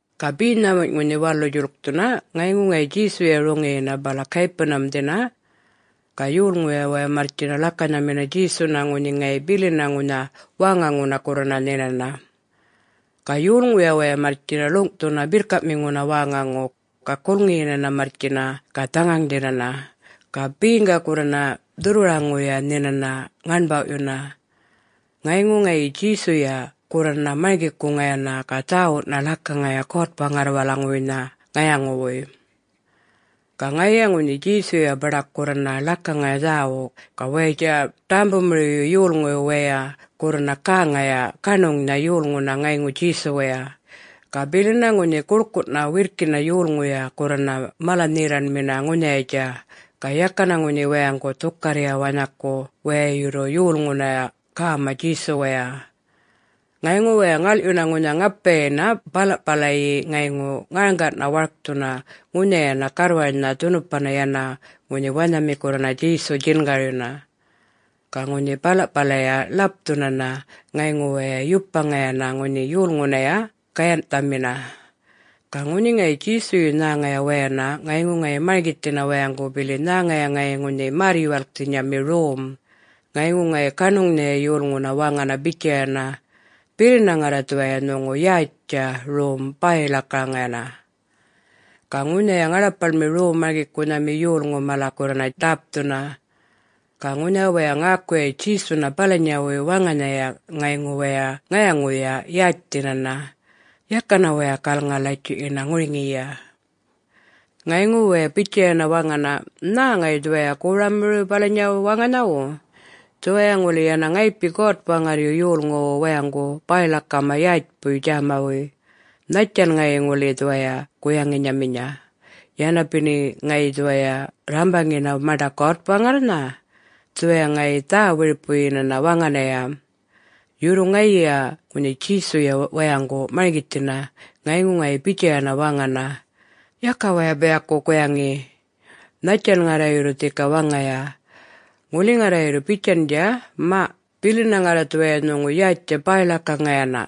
Ga be nhämunyꞌ ŋunhi walu djuḻkthuna, ŋayŋu ŋayi Djesuya roŋiyina bala Capernaum-dhina. Ga yolŋu waya marrtjina ḻakanhamina Djesuna ŋunhi ŋayi bilina ŋunha wäŋaŋuna gurrana nhinana. Ga yolŋuya waya marrtjina ḻuŋꞌthuna birrkaꞌmiŋuna wäŋaŋu. Ga gulŋiyina marrtjina ga dhaŋaŋdhina, ga beŋga gurrana dhurrwaraŋuya nhinana ŋaṉbawꞌyuna. Ŋayŋu ŋayi Djesuya gurrana marŋgikuŋayana ga dhäwuꞌna ḻakaŋaya God-Waŋarrwalaŋuwuynha ŋayaŋuwuy. Ga ŋayiya ŋunhi Djesuya baḏak gurrana ḻakaŋaya dhäwuꞌ, ga wayatja ḏämbumiriwyu yolŋuyu wayay gurrana gäŋaya gaṉuŋnha yolŋuna ŋayŋu Djesuwaya. Ga bilina ŋunhi guḻkuꞌna wirrkina yolŋuya gurrana mala-nherraṉmina ŋunhayatja, ga yakana ŋunhi wayaŋgu dhukarrya wanhaku waya yurru yolŋunaya gäma Djesuwaya. Ŋayŋu waya ŋalꞌyuna ŋunha ŋapayina balaꞌpalayi ŋayŋu ŋarŋgana warkthuna ŋunhayana garrwarnha dhunupana yana ŋunhi wanhami gurrana Djesu djingaryuna. Ga ŋunhi balaꞌpalaya ḻapthunana ŋayŋu waya yupmaŋayana ŋunhi yolŋunaya gayanhꞌthamina. Ga ŋunhi ŋayi Djesuyu nhäŋaya wayana ŋayŋu ŋayi marŋgithina wayaŋgu bili nhäŋaya ŋayi ŋunhi märr-yuwalkthinyami rom, ŋayŋu ŋayi gaṉuŋnhaya yolŋuna waŋana bitjayana, “Bilina ŋarra dhuwaya nhuŋu yätjtja rom bäy-ḻakaŋayana.” Ga ŋunhaya ŋaḻapaḻmi Rom-marŋgikunhami yolŋu mala gurrana ḏäpthuna. Ga ŋunhi waya ŋäkuya Djesuna balanyawuy waŋanhaya ŋayŋu waya ŋayaŋuya yätjthinana, yakana waya galŋa-latjuꞌyina ŋuriŋiyi. Ŋayŋu waya bitjayana waŋana, “Nhä ŋayi dhuwaya goramiriw balanyawu waŋanhawu. Dhuwaya ŋuli yana ŋayipi God-Waŋarryu yolŋuwu wayaŋgu bäy-ḻakama yätjpuy djämawuy. Nhattjan ŋayi ŋuli dhuwaya guyaŋinyamiya, yana bini ŋayi dhuwaya rrambaŋina maṉḏa God-Waŋarrnha? Dhuwaya ŋayi dhä-wiripuyinana waŋanaya!” Yurru ŋayiya ŋunhi Djesuya wayaŋgu marŋgithina, ŋayŋu ŋayi bitjayana waŋana, “Yaka waya biyaku guyaŋi! Nhattjan ŋarra yurru dhika waŋaya? Ŋuli ŋarra yurru bitjandja, ‘Maꞌ, bilina ŋarra dhuwaya nhuŋu yätjtja bäy-ḻakaŋayana’,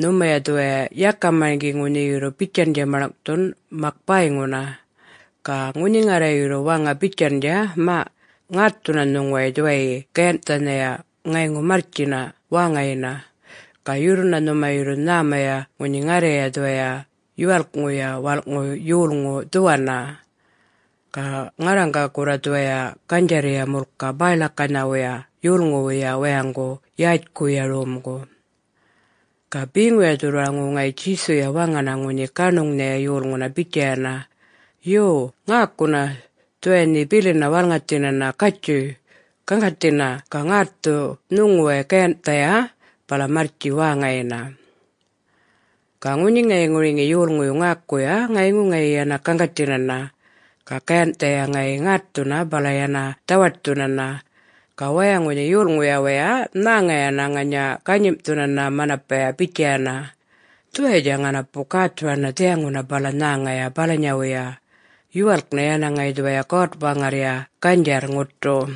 nhumaya dhuwaya yaka marŋgi ŋunhi yurru bitjandja maḻŋꞌthun, mak bäyŋuna. Ga ŋunhi ŋarra yurru waŋa bitjandja, ‘Maꞌ, ŋaṯthuna nhuŋuway dhuwayyi gayanhꞌthaya ŋayŋu marrtji wäŋayina’, ga yurruna nhuma yurru nhämaya ŋunhi ŋarraya dhuwaya Yuwalkŋuya Walꞌŋu Yolŋu dhuwanna. Ga ŋarraŋga gurra dhuwaya ganydjarrya mulka bäy-ḻakanhawuya yolŋuwuya wayaŋgu yätjkuya romgu.” Ga beŋuya dhurrwaraŋu ŋayi Djesuya waŋana ŋunhi gaṉuŋnhaya yolŋuna bitjayana, “Yo, ŋäkuna! Dhuwaya nhe bilina walŋathinana, gatjuy, gaŋgathina ga ŋätthu nhuŋuway gayanhꞌthaya bala marrtji wäŋayina.” Ga ŋunhi ŋayi ŋuriŋi yolŋuyu ŋäkuya, ŋayŋu ŋayi yana gaŋgathinana. Ga gayanhꞌthaya ŋayi ŋätthuna bala yana dhawaṯthunana. Ga waya ŋunhi yolŋuyuya wayay nhäŋayana ŋanya ganyimꞌthunana manapaya bitjayana, “Dhuwayatja ŋanapu gäthurana dhiyaŋuna bala nhäŋaya balanyawuya. Yuwalk yana ŋayi dhuwaya God-Waŋarrya ganydjarr ŋuṯu.”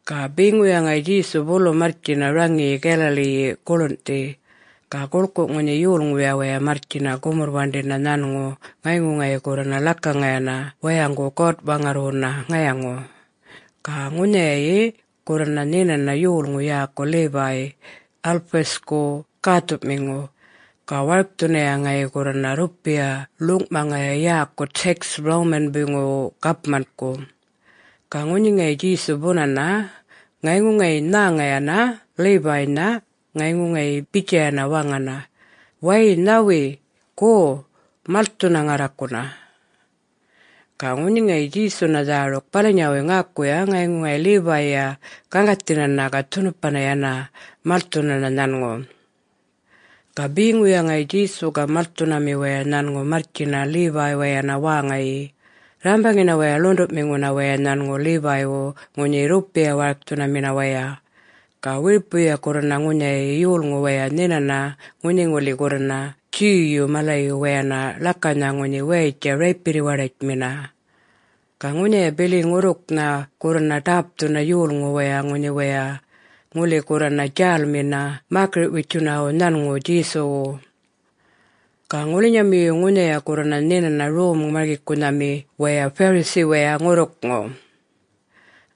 Ga beŋuya ŋayi Djesu bulu marrtjina raŋiyi Galilee-yi guḻunꞌthi. Ga guḻkuꞌ ŋunhi yolŋuya waya marrtjina gumurr-waṉḏina nhanŋu ŋayŋu ŋayi gurrana ḻakaŋayana wayaŋgu God-Waŋarrwuna ŋayaŋu. Ga ŋunhayayi gurrana nhinana yolŋu yäku Levi, Alphaeus-ku gäthuꞌmiŋu. Ga warkthunaya ŋayi gurrana rrupiya ḻuŋꞌmaŋaya yäku tax Roman-buyŋuwu gapmangu. Ga ŋunhi ŋayi Djesu bunana, ŋayŋu ŋayi nhäŋayana Levi-nha. Ŋayŋu ŋayi bitjayana waŋana, “Wäy nhawi, go! Malthuna ŋarrakuna!” Ga ŋunhi ŋayi Djesuna dhäruk balanyawuy ŋäkuya, ŋayŋu ŋayi Levi-ya gaŋgathinana ga dhunupana yana malthunana nhanŋu. Ga beŋuya ŋayi Djesu ga malthunami waya nhanŋu marrtjina Levi-wayana wäŋayi, rrambaŋina waya ḻuṉḏuꞌmiŋuna waya nhanŋu Levi-wu ŋunhi rrupiya-warkthunamina waya. Ga wiripuya gurrana ŋunhayayi yolŋu waya nhinana ŋunhi ŋuli gurranha Jew-yu malayu wayana ḻakanha ŋunhi wayatja raypirri-waḏatjmina. Ga ŋunhaya bili ŋurrukŋu gurrana ḏäpthuna yolŋu waya ŋunhi waya ŋuli gurrana djälminya mäkiriꞌ-witjunawu nhanŋu Djesuwu. Ga ŋulinyamiyu ŋunhaya gurrana nhinana rom-marŋgikunhami waya Pharisee-waya ŋurrukŋu.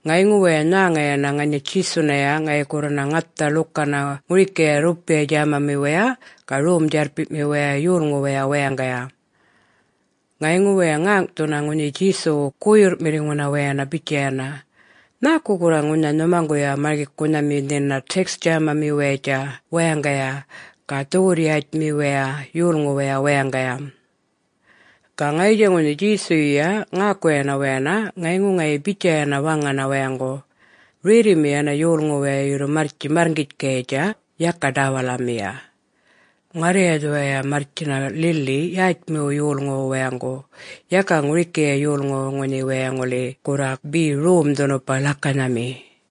Ŋayŋu waya nhäŋayana ŋanya Djesunaya ŋayi gurrana ŋatha ḻukana ŋurikaya rrupiya djämamiwaya ga rom-djarrpiꞌmiwaya yolŋuwaya wayaŋgaya. Ŋayŋu waya ŋäŋꞌthuna ŋunhi Djesuwu guyurrꞌmiŋuna wayana bitjaya, “Nhäku gurra ŋunha nhumaŋguya marŋgikunhami nhina tax djämamiwayatja wayaŋgaya ga dhuwurr-yätjmiwaya yolŋuwaya wayaŋgaya?” Ga ŋayitja ŋunhi Djesuyuya ŋäkuya wayana, ŋayŋu ŋayi bitjayana waŋana wayaŋgu, “Rerrimi yana yolŋu waya yurru marrtji marrŋgitjkayatja, yaka ḏäwalamiya. Ŋarraya dhuwaya marrtjina lili yätjmiwu yolŋuwu wayaŋgu, yaka ŋurikiya yolŋuwu ŋunhi waya ŋuli gurra be rom-dhunupa ḻakanhami.”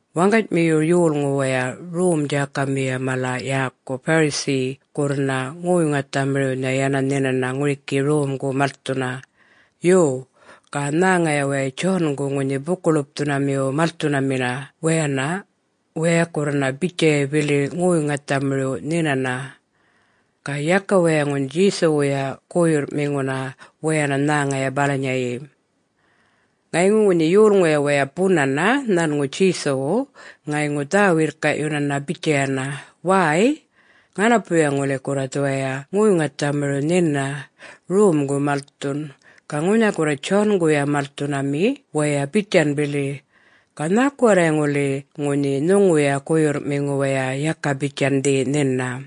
Waŋganymiyu, yolŋu waya Rom-djákamiya mala yäku Pharisee gurrana ŋoy-ŋathamiriwnha yana nhinana ŋuriki romgu malthuna. Yo, ga nhäŋaya waya John-gu ŋunhi Buku-ḻupthunamiwu malthunamina wayana waya gurrana bitjaya bili ŋoy-ŋathamiriw nhinana. Ga yaka waya ŋunhi Djesuwuya guyurrꞌmiŋuna wayana nhäŋaya balanyayi. Ŋayŋu ŋunhi yolŋuya waya bunana nhanŋu Djesuwu ŋayŋu dhä-wirrkaꞌyunana bitjayana, “Wäy, ŋanapuya ŋuli gurra dhuwaya ŋoy-ŋathamiriw nhina, romgu malthun. Ga ŋunha gurra John-guya malthunami waya bitjan bili. Ga nhäku warray ŋuli ŋunhi nhuŋuya guyurrꞌmiŋu waya yaka bitjandhi nhina?”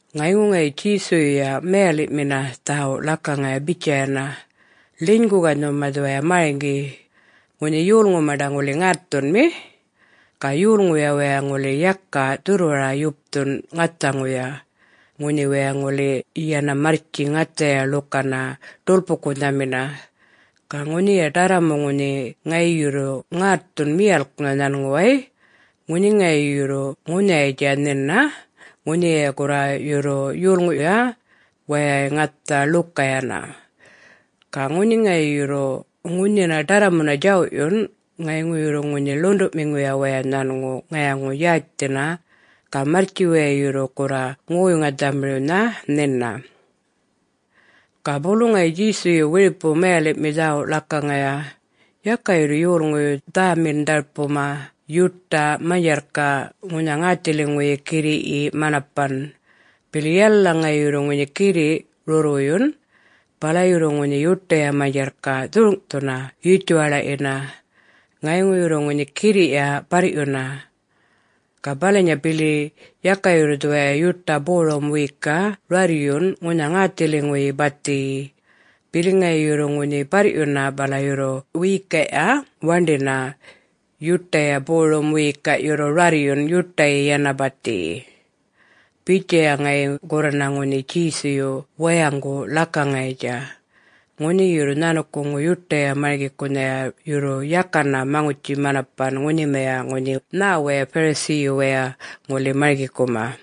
Ŋayŋu ŋayi Djesuyuya mayaliꞌmina dhäwuꞌ ḻakaŋaya bitjayana, “Ḻinygu ga nhuma dhuwaya marŋgi: Ŋunhi yolŋu maṉḏa ŋuli ŋätthunmi, ga yolŋuya waya ŋuli yaka dhurrwara-yupthun ŋathaŋuya, ŋunhi waya ŋuli yana marrtji ŋathaya ḻukana ḏulpu-gunhamina. Ga ŋunhiya ḏarramu ŋunhi ŋayi yurru ŋätthun miyalknha nhanŋuway, ŋunhi ŋayi yurru ŋunhayatja nhina, ŋunhiya gurra yurru yolŋuyuya wayay ŋatha ḻuka yana. Ga ŋunhi ŋayi yurru ŋunhina ḏarramuna djawꞌyun, ŋayŋu yurru ŋunhi ḻuṉḏuꞌmiŋuya waya nhanŋu ŋayaŋu-yätjthina ga marrtji waya yurru gurra ŋoy-ŋathamiriwnha nhina.” Ga bulu ŋayi Djesuyu wiripu mayaliꞌmi dhäwuꞌ ḻakaŋaya, “Yaka yurru yolŋuyu dhamin-dharpuma yuṯa manydjarrkaꞌ ŋunha ŋäthiliŋuyi girriꞌyi manapan. Bili yalala ŋayi yurru ŋunhi girriꞌ rurrwuyun, bala yurru ŋunhi yuṯaya manydjarrkaꞌ dhurŋꞌthuna yutjuwaḻaꞌyina, ŋayŋu yurru ŋunhi girriꞌya barrꞌyuna. Ga balanya bili: Yaka yurru dhuwaya yuṯa borum wikaꞌ rarryun ŋunha ŋäthiliŋuyi bathiyi, bili ŋayi yurru ŋunhi barrꞌyuna bala yurru wiyikaꞌya waṉḏina. Yuṯaya borum wiyikaꞌ yurru rarryun yuṯayi yana bathiyi.” [Bitjaya ŋayi gurrana ŋunhi Djesuyu wayaŋgu ḻakaŋayatja, ŋunhi yurru nhanukuŋu yuṯaya marŋgikunhaya yurru yakana maŋutji-manapan ŋunhimaya ŋunhi nhä waya Pharisee-yu wayay ŋuli marŋgikuma.]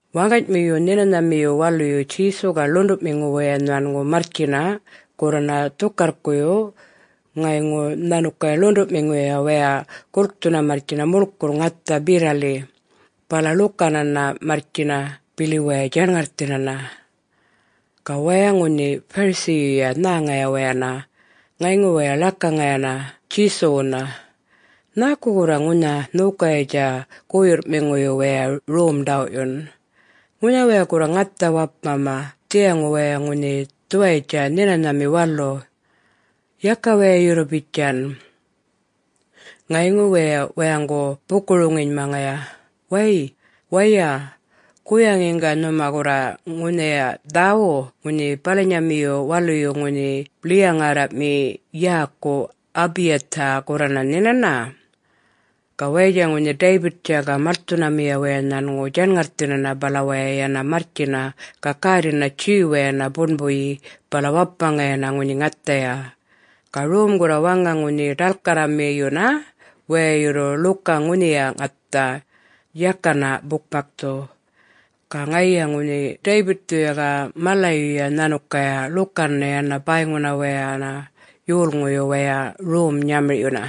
Waŋganymiyu Nhinanhamiyu Waluyu Djesu ga ḻuṉḏuꞌmiŋu waya nhanŋu marrtjina gurrana dhukarrkuyu ŋayŋu nhanukaya ḻuṉḏuꞌmiŋuya wayay gulkthuna marrtjina muḻkurr ŋatha berrali bala ḻukanana marrtjina bili waya djaṉŋarrthina. Ga waya ŋunhi Pharisee-yuya nhäŋaya wayana, ŋayŋu waya ḻakaŋayana Djesuwuna, “Nhäku gurra ŋunha nhokayatja guyurrꞌmiŋuyu wayay rom ḏawꞌyun? Ŋunha waya gurra ŋatha wapmama dhiyaŋu wayay ŋunhi dhuwayatja Nhinanhami Walu. Yaka waya yurru bitjan!” Ŋayŋu waya wayaŋgu buku-roŋinymaŋaya, “Wäy, waya, guyaŋiŋga nhuma gurra ŋunhiya dhäwuꞌ ŋunhi balanyamiyu waluyu ŋunhi ḻiya-ŋärraꞌmi yäku Abiathar gurrana nhinana? Ga wayatja ŋunhi David-tja ga malthunamiya waya nhanŋu djaṉŋarrthinana bala waya yana marrtjina ga gärrina Jew-wayana buṉbuyi bala wapmaŋayana ŋunhi ŋathaya. Ga rom gurra waŋa ŋunhi ḏalkarramiyuna waya yurru ḻuka ŋunhiya ŋatha, yakana bukmakthu. Ga ŋayiya ŋunhi David-thuya ga malayuya nhanukaya ḻukana yana bäyŋu wayana yolŋuyu wayay rom-nyamirꞌyuna.”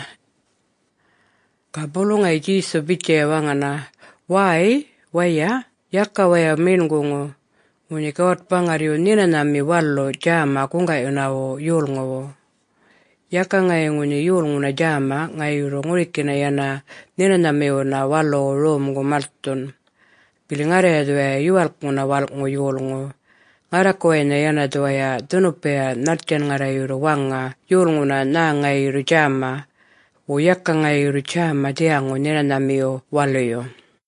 Ga bulu ŋayi Djesu bitjaya waŋana, “Wäy waya, yaka waya meṉguŋu, ŋunhi God-Waŋarryu Nhinanhami Walu djäma guŋgaꞌyunawu yolŋuwu. Yaka ŋayi ŋunhi yolŋuna djäma ŋayi yurru ŋurikina yana Nhinanhamiwuna Waluwu romgu malthun. Bili ŋarraya dhuwaya Yuwalkŋuna Walꞌŋu Yolŋu, ŋarrakuwaynha yana dhuwaya dhunupaya nhattjan ŋarra yurru waŋa yolŋuna nhä ŋayi yurru djäma, wo yaka ŋayi yurru djäma dhiyaŋu Nhinanhamiyu Waluyu.”